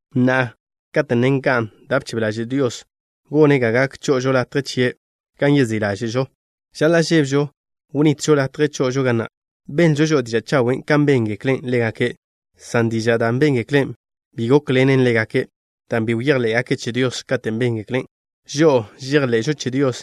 Na'a, kate' ne nga'n da' bchebe ḻaže' Dios, gone' ga gak cho'ožo latje chie' gan yezí' ḻáže'žo, žaḻa' žébežo wnitžo latje cho'ožo ga na'. Benlžo žo'o diža' chawen' kan béngekle' ḻégake', san dižan' da' béngekle' bi gókḻenen ḻégake', dan' bi bejḻé'gake' che Dios katen' béngeklen'. Žo'o žejḻe'žo che Dios,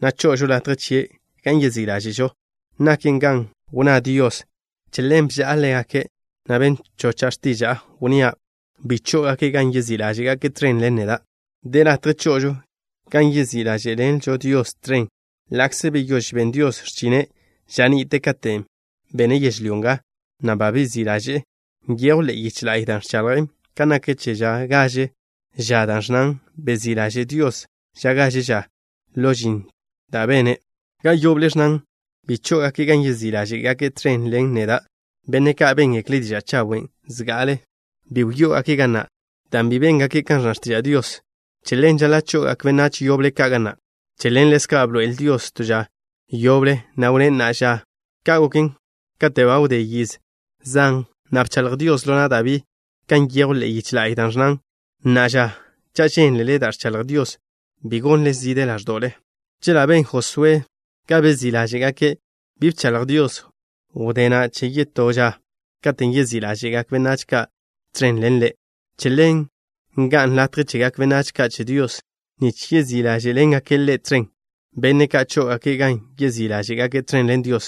na' cho'ožo latje chie' gan yezí' ḻáže'žo. Naken kan wnná Dios: Che ḻen bža'a ḻégake' na' ben chocha' x̱tiža'a, wnnía': “Bi chó'ogake' gan yezí' ḻáže'gake' tẕen ḻen neda'.” De latje cho'ožo gan yezí' ḻáže'ḻenžo Dios tẕen, ḻa'kze beyóž ben Dios x̱chine' ža ni'te katen' bene' yežlyó nga, na' ba bezí' ḻaže'e. Nyejw ḻe'e yiche la'y da' ẕchaḻjen kan nak che ža gaže ža, da' ẕnnan: “Bezí' ḻaže' Dios ža gaže ža ḻo žin da' bene'.” Ga yoble ẕnnan: “Bi chó'ogake' gan yezí' ḻáže'gake' tẕen ḻen neda'.” Benne' ka' béngekle' diža' chawen' zga'ale, bi wyó'ogake' ga na' dan' bi béngake' kan ẕnna x̱tiža' Dios. Che ḻen, žaḻa' cho'ogak benách yoble ka' ga na'. Che ḻen, ḻezka' bḻoe'el Dios to ža yoble, na' wnné': “na'a ža.” Ka' goken, kate' ba wdé yiz zan, na' bchaḻj Dios ḻo na' Dabí, kan nyejw ḻe'e yiche la'y, da' ẕnnan: Na'a ža, cha' žénlele da' ẕchaḻj Dios, bi gonle zide ḻáẕdo'le. Chela' ben Josué ga bezí' ḻáže'gake', bi bchaḻj Dios wdé na' che yetó ža katen' yezí' ḻáže'gak benách ka' tẕen ḻen Ḻe'. Che ḻen, nga'n latje chegak benách ka' che Dios nich yezí' ḻáže'ḻengake' Ḻe' tẕen. Benne' ka' chó'ogake' gan yezí' ḻáže'gake' tẕen ḻen Dios,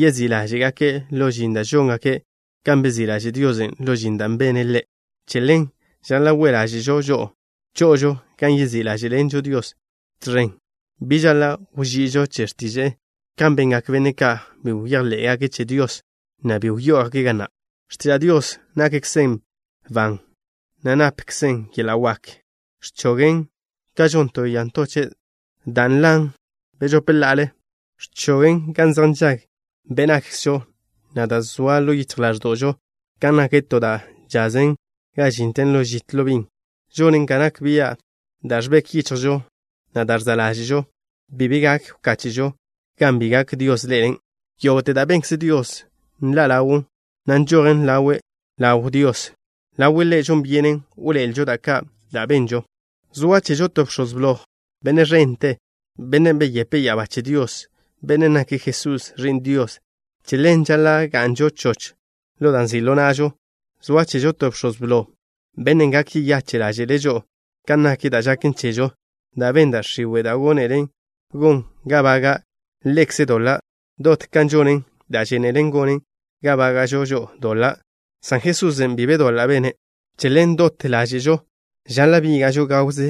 yezí' ḻáže'gake' ḻo žin da' žóngake', kan bezí' ḻaže' Diosen' ḻo žin da' bene' Ḻe'. Che ḻen, žaḻa' we' ḻáže'žo cho'ožo gan yezí' ḻáže'ḻenžo Diosen' tẕen. Bi žaḻa' wží'ižo che x̱tiže'e kan bengak benne' ka' bi bejḻé'gake' che Dios, na' bi wyó'ogake' ga na'. X̱tiža' Dios nakkzen ban, na' napkzen yeḻa' wak. Ẕchogžen ka žon to ya ntoche' da' ntochen' bežope ḻa'al. Ẕchogen gan zej nžag be' nakkzžo, na' da' zoa ḻo yichj ḻáẕdo'žo, ka nak to da' chazen ga žinten ḻo žit ḻo bin. Žonen ga nak bia' da' ẕbek yichjžo, na' da' ẕza' ḻáže'žo. Bi be gak wkáche'žo gan bi gak Dios ḻe'elen'. Yógo'te da' benkze Dios nḻa' ḻawn, na' nžojen ḻawe' ḻaw ḻaw Dios. Ḻawe' Ḻe' žon byenen wḻoe'elžo da' ka' da' benžo. Zoa chežo to Bx̱oz Blo, Benne' ẕente, Bennen' beyepe' ya'abá che Dios. Bennen' nake' Jesús, Ẕi'n Dios. Che ḻen žaḻa' ga'nžo choch ḻo da' nzi' ḻo na'žo. Zoa chežo to Bx̱oz Blo, Bennen' gak yeyache' ḻáže'le' žo'o kan nak da' žaken chežo, dan' ben da' x̱iwe' da' gónelen gon ga baga' Ḻekze' doḻa' dot kan žonen da' žénelen gonen ga bága'žo žo'o doḻa', san Jesusen', bi be doḻa' bene'. Che ḻen, dot ḻáže'žo žaḻa' bíga'žo gawze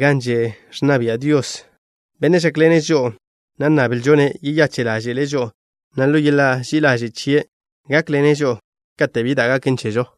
gan že' ẕnna bia' Dios, Bennen' žákḻene' žo'o, na' nnablžo-ne' yeyache' ḻáže'le' žo'o, na' ḻo yeḻa' ži'i ḻaže' chie', gákḻene' žo'o kate' bi da' gaken chežo.